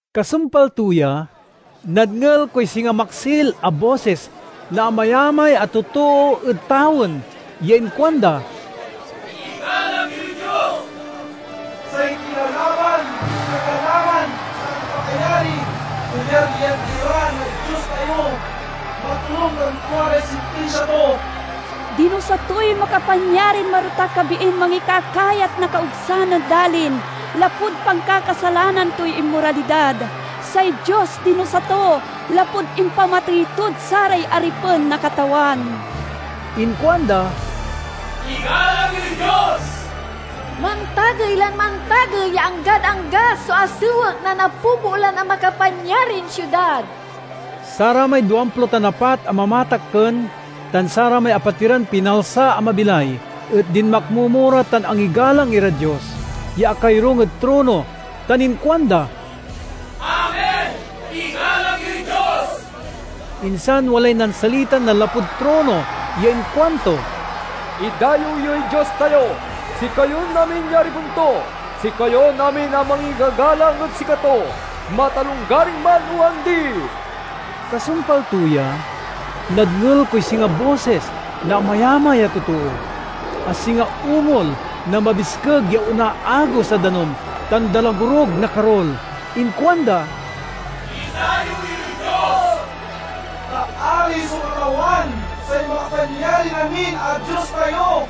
Kasumpal to ya, nadngel koy singa maksil a bosis na amayamay a totoo ed tawen ya inkuanda, "Igalang yoy Dios! Say kilalaban, kagalangan, tan pakayari kayaryan ira na Dios tayo! Matonung tan tua ray sintinsia to! Dinusa toy makapanyarin marotak a biin mangikakayat na kaogsan ed dalin, lapud pankakasalanan toy inmoralidad. Say Dios dinusa to, lapud impamatey tod saray aripen na Katawan." Inkuanda, "Igalang yoy Dios! Mantagey lan mantagey ya anggad angga so asewek na napopoolan a makapanyarin siudad!" Saramay duamplo tan apat a mamatakken tan saramay apatiran pinalsa a mabilay et dinmakmomo ra tan angigalang irad Dios ya akayorung ed trono, tan inkuanda, "Amen! Igalang yoy Dios!" Insan walay nansalitan nanlapud trono ya inkuanto, "Idayew yoy Dios tayo, sikayon amin ya aripen to, sikayon amin a mangigagalang ed sikato, matalonggaring man o andi!" Kasumpal to ya, nadngel koy singa bosis na amayamay a totoo, a singa ungol na mabiskeg ya onaagos a danum tan dalagorug na karul. Inkuanda, "Idayew yoy Dios! Ta Ari so Katawan, say Makapanyarin-amin a Dios tayo!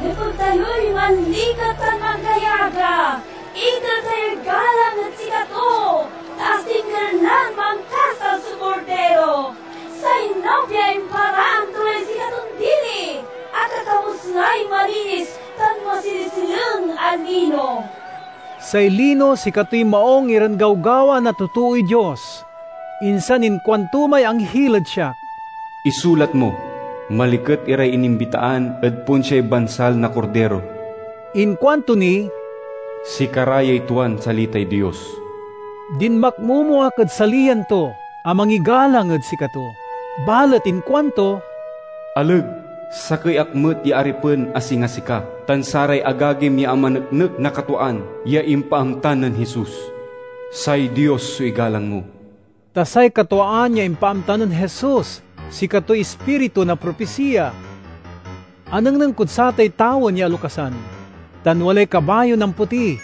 Nepeg tayoy manliket tan manggayaga; iter tayoy galang ed sikato! Ta asingger lan mankasal so Kordiro. Say nobia imparaan to lay sikaton dili; akakawes lay malinis tan masilesileng a lino." (Say lino sikatoy maung iran gawgawa na totooy Dios.) Insan inkuanto may anghil ed siak; "Isulat mo: Maliket iray inimbitaan ed ponsiay bansal na Kordiro." Inkuanto ni, "Sikara yay tuan salitay Dios." Dinmakmomo ak ed saliyan to a mangigalang ed sikato, balet inkuanto, "Aleg! Sakey ak met ya aripen a singa sika tan saray agagim ya amaneknek na katwaan ya impaamta nen Jesus. Say Dios so igalang mo!" Ta say katwaan ya impaamta nen Jesus sikatoy ispiritu na propisiya. Anengneng kod satay tawen ya alokasan, tan walay kabayon ampoti.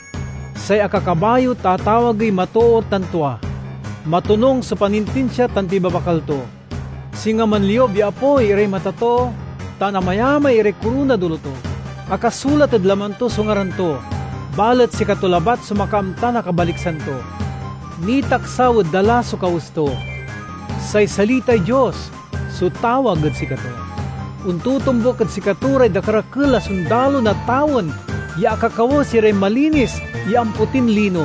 Say akakabayo tatawagey Matoor tan Tua; matonung so panintinsia tan pibabakal to. Singa manliub ya apoy iray mata to, tan amayamay iray koronad olo to. Akasulat ed laman to so ngaran to, balet sikato labat so makaamta na kabaliksan to. Nitaksaw ed dala so kawes to. "Say Salitay Dios" so tawag ed sikato. Ontotombuk ed sikato ray dakerakel a sondalo na tawen ya akakawes iray malinis ya ampotin lino,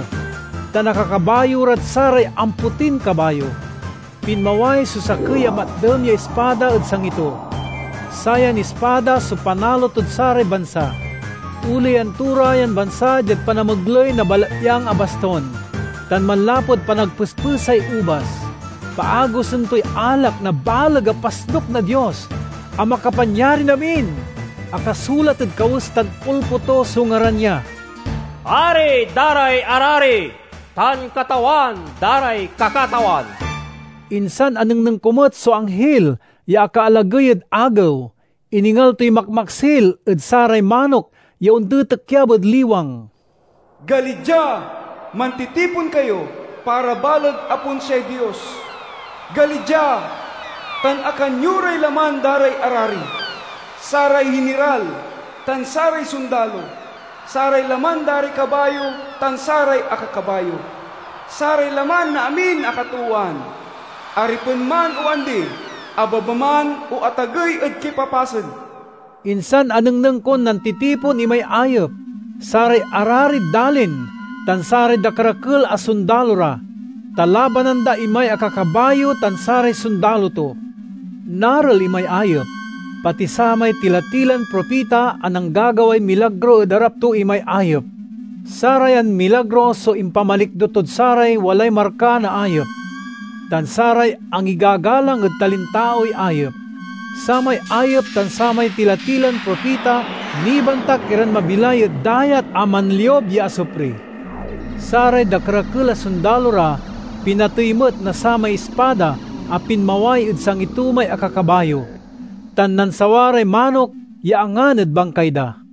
tan akakabayo rad saray ampotin kabayo. Pinmaway so sakey a matdem ya ispada ed sangi to; sayan ispada so panalo tod saray bansa. Oleyan to ra yan bansa diad panamegley na balatyang a bastun, tan manlapud panagpespesay ubas, paagosen toy alak na baleg a pasnuk na Dios a Makapanyarin-amin. Akasulat ed kawes tan ulpo to so ngaran ya, "Ari da ray arari, tan Katawan da ray kakatawan." Insan anengneng ko met so anghil ya akaalagey ed agew. Iningal toy makmaksil ed saray manok ya ontitikyab ed liwang: "Gali dia, mantitipon kayo para baleg a ponsiay Dios! Gali dia, tan akan yo ray laman da ray arari, saray hiniral, tan saray sondalo, saray laman da ray kabayo tan saray akakabayo, saray laman na amin a katoowan—aripen man o andi, abeba man o atagey ed kipapasen!" Insan anengneng kon nantitipon imay ayep, saray ararid dalin, tan saray dakerakel a sondalo ra, ta labanan da imay akakabayo tan saray sondalo to. Narel imay ayep, pati samay tila-tilan propita a nanggagaway milagro ed arap to imay ayep. (Sarayan milagro so impamalikdo tod saray walay marka na ayep, tan saray angigagalang ed talintaoy ayep.) Samay ayep tan samay tila-tilan propita nibantak iran mabilay ed dayat a manliub ya asupri. Saray dakerakel a sondalo ra pinatey met na samay ispada a pinmaway ed sangi to may akakabayo; tan nansawa ray manok ya angan ed bangkay da.